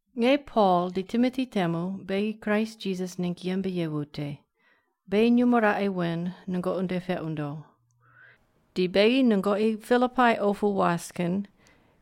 Nge Pol di Timoti temu beghi Kraist Jisas ningg yembe ye wute, beghi nyumo raqe wen nungoqi nde peq wundo. Di beghi nungoqi Pilipai opu was kin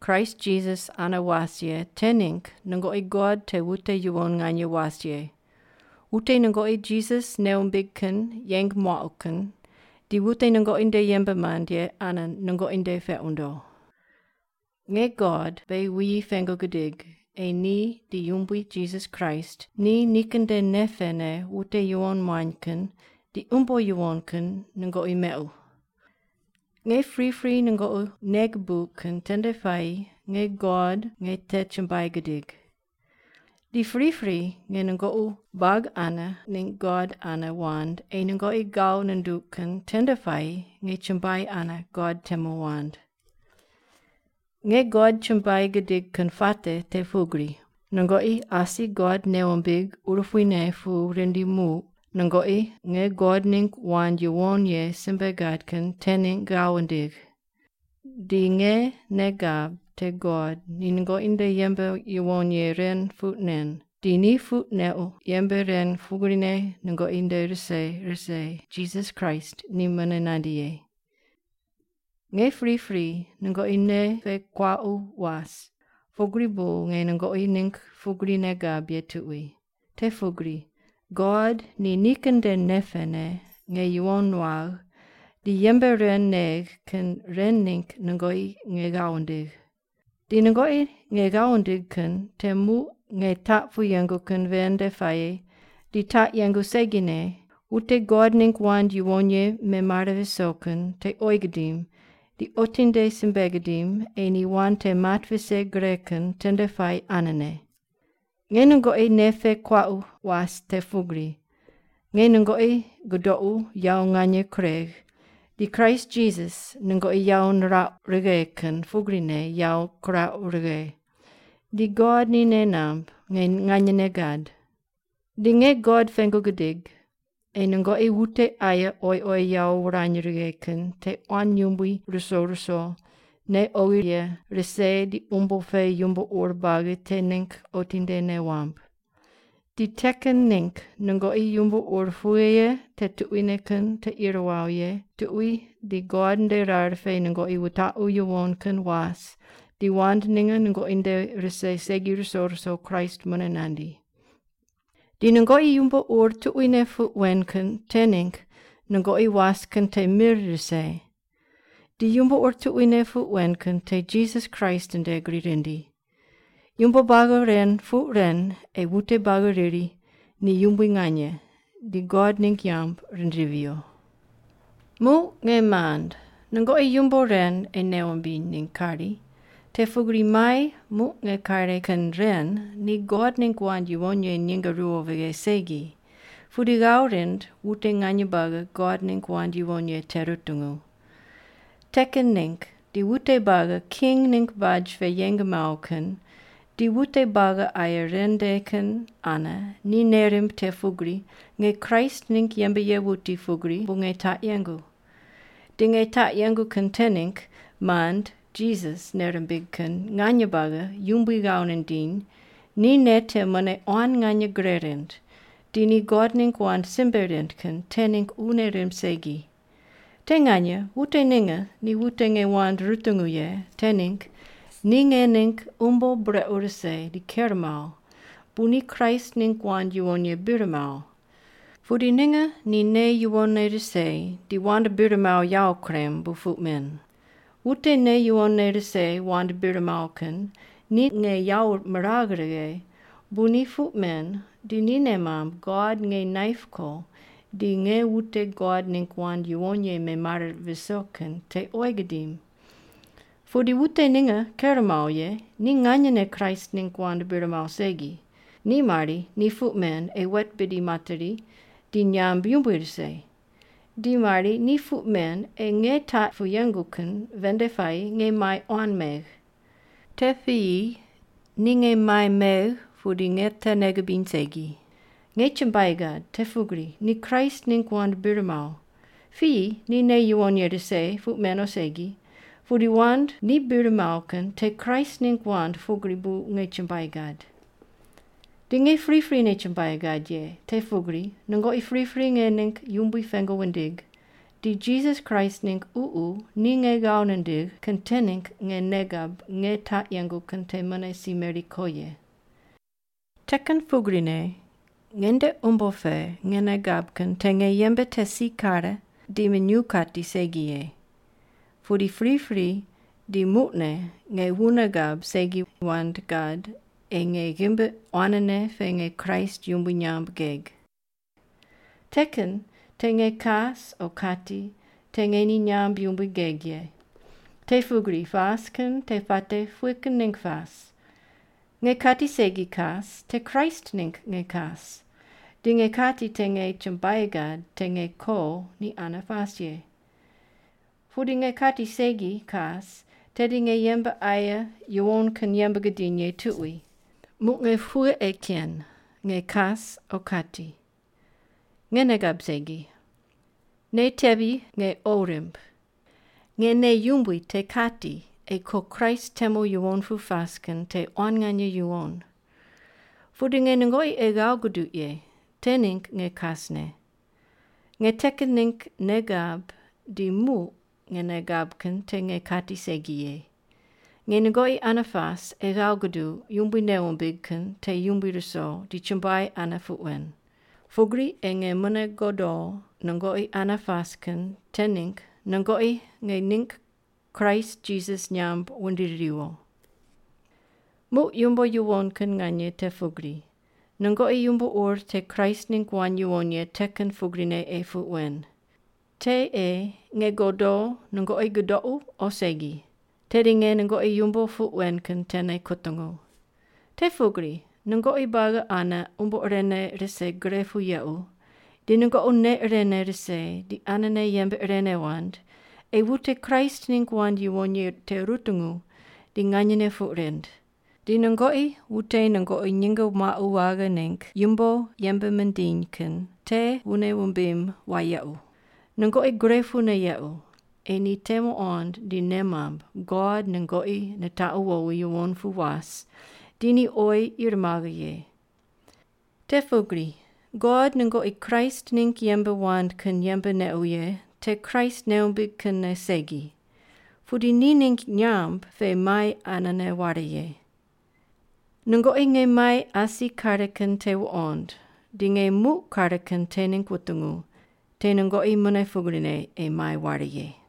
Kraist Jisas ane was ye te ningg nungoqi God te wute yuwon nganye was ye, wute nungoqi Jisas nei wumbig kin yeng muauq kin, di wute nungoqi nde yembe mand ye ane nungoqi nde peq wundo. Nge God beghi wuyi pengu gidig ei ni di Yumbui Jisas Kraist ni nikin nde nei pene wute yuwon muany kin di umbo yuwon kin nungoqi meuq. Nge pripri nungoqi nei gubuq kin tende puayi nge God nge te chumbuai gidig. Di pripri nge nungoqi buagi ane ningg God ane wand ei nungoqi ghav nunduq kin tende puayi nge chumbuai ane God temu wand. Nge God chumbuai gidig kin puate te pugri: Nungoqi asi God nei wumbig urupuine pu rindi muq nungoqi nge God ningg wand yuwon ye simbe gad kin te ningg ghav wundigh. Di nge nei gab te God ni nungoqi nde yembe yuwon ye ren puq nen, di ni puq neuq yembe ren pugrine nungoqi nde rise rise Jisas Kraist ni mune nandi ye. Nge pripri nungoqi nei pe kuaqu was. Pugri bu nge nungoqi ningg pugri nei gab ye tuqui, te pugri God ni nikin nde nei pene nge yuwon nuagh di yembe ren negh kin ren ningg nungoqi nge ghav wundigh. Di nungoqi nge ghav wundigh kin te muq nge taq pu yengu kin ven nde puayi di taq yengu segine wute God ningg wand yuwon ye memare viso kin te oyi gidim di otinde simbe gidim ei ni wand te mat vise gre kin tende puayi anene. Nge nungoqi nei pe kuaqu was te pugri nge nungoqi gudoqu yawo nganye kuregh di Kraist Jisas nungoqi yawo nirauq righe kin pugrine yawo kirauq righe, di God ni nei namb nge nganyene gad. Di nge God pengu gidig ei nungoqi wute aye oyi oyi yawo wurany righe kin te quan yumbui ruso ruso, nei oghi ye rise di umbo pe yumbo ur buagi te ningg otinde nei wamb. Di te kin ningg nungoqi yumbo ur pughe ye te tuquine kin te ir wawo ye tuqui di God nde rar pe nungoqi wutaqu yuwon kin was di wand ninge nungoqi nde rise segi ruso ruso Kraist mune nandi. Di nungoqi yumbo ur tuquine puq wen kin te ningg nungoqi was kin te mir rise. Di yumbo ur tuquine puq wen kin te Jisas Kraist nde gri rindi. Yumbo buagi ren puq ren ei wute buagi riri ni yumbui nganye di God ningg nyamb rindivi viyo. Muq, nge mand, nungoqi yumbo ren ei nei wumbiny ningg kari, te pugri mai muq nge kare kin ren ni God ningg wand yuwon ye nyinge ruwo vighe segi, pudi ghav rind wute nganye buagi God ningg wand yuwon ye te rutungu. Te kin ningg di wute buagi king ningg baj pe yeng mawo kin di wute buagi aye ren nde kin ane ni nei rimb te pugri nge Kraist ningg yembe ye wuti pugri bu nge taq yengu. Di nge taq yengu kin te ningg mand Jisas nei rimbig kin nganye buagi Yumbui ghav nindiny ni nei te mune quan nganye gre rind di ni God ningg wand simbe rind kin te ningg wune rimb segi. Te nganye wute ninge ni wute nge wand rutungu ye te ningg ni nge ningg umbo brequ rise di ker mawo bu ni Kraist ningg wand yuwon ye bir mawo. Pudi ninge ni nei yuwonne rise di wand bir mawo yawo kurem bu puq men. Wute nei yuwonne rise wand bir mawo kin ni nge yawo miragh righe bu ni puq men di ni nei mamb God nge naip ko di nge wute God ningg wand yuwon ye memare viso kin te oyi gidim. Pudi wute ninge ker mawo ye ni nganyene Kraist ningg wand bir mawo segi. Ni mari ni puq men ei wet bidi materi di nyamb yumbui rise, di mari ni puq men ei nge taq pu yengu kin ven nde puayi nge mai quan megh. Te piyi ni nge mai megh pudi nge te nei gibiny segi. Nge chumbuai gad te pugri ni Kraist ningg wand bir mawo. Piyi ni nei yuwon ye rise puq men o segi, pudi wand ni bir mawo kin te Kraist ningg wand pugri bu nge chumbuai gad. Di nge priprine chumbuai gad ye, te pugri nungoqi pripri nge ningg Yumbui pengu wundig di Jisas Kraist ningg Ququ ni nge ghav nindigh kin te ningg nge nei gab nge taq yengu kin te mune si meri ko ye. Te kin pugrine nge nde umbo pe nge nei gab kin te nge yembe te si kare di minyuw kati segi ye, pudi pripri di muqne nge wune gab segi wand gad ei nge ghimbi quanene pe nge Kraist yumbui nyamb geg. Te kin te nge kas o kati te nge ni nyamb yumbui geg ye. Te pugri pas kin te puate pughe kin ningg pas? Nge kati segi kas te Kraist ningg nge kas. Di nge kati te nge chumbuai gad te nge ko ni ane pas ye. Pudi nge kati segi kas tedi nge yembe aye yuwon kin yembe gidiny ye tuqui. Muq nge pughe ei ken, nge kas o kati. Nge nei gab segi. Nei tevi nge qo rimb. Nge nei yumbui te kati ei ko Kraist temu yuwon pu pas kin te quan nganye yuwon. Pudi nge nungoqi ei ghav guduq ye, te ningg nge kasne. Nge te kin ningg nei gab di muq nge nei gab kin te nge kati segi ye. Nge nungoqi ane pas ei ghav guduq Yumbui nei wumbig kin te yumbui ruso di chumbuai ane puq wen. Pugri ei nge mune godo nungoqi ane pas kin te ningg nungoqi nge ningg Kraist Jisas nyamb wundiri riwo. Muq yumbo yuwon kin nganye te pugri nungoqi yumbo ur te Kraist ningg wand yuwon ye te kin pugrine ei puq wen. Te ei nge godo nungoqi gudoqu o segi, tedi nge nungoqi yumbo puq wen kin tene kutungu. Te pugri nungoqi buagi ane umbo irene rise gre pu yequ, di nungoqi nei irene rise di anene yembe irene wand ei wute Kraist ningg wand yuwon ye te rutungu di nganyene puq rind. Di nungoqi wute nungoqi nyinge muaqu waghe ningg yumbo yembe mindiny kin te wune wumbim wayequ. Nungoqi gre pune yequ ei ni te muqond di nei mamb God nungoqi nitaqu wowi yuwon pu was di ni oyi ir maghe ye. Te pugri God nungoqi Kraist ningg yembe wand kin yembe neuq ye te Kraist nei wumbig kinne segi, pudi ni ningg nyamb pe mai anene ware ye. Nungoqi nge mai asi kare kin te wuqond di nge muq kare kin te ningg wutungu, te nungoqi mune pugrine ei mai ware ye.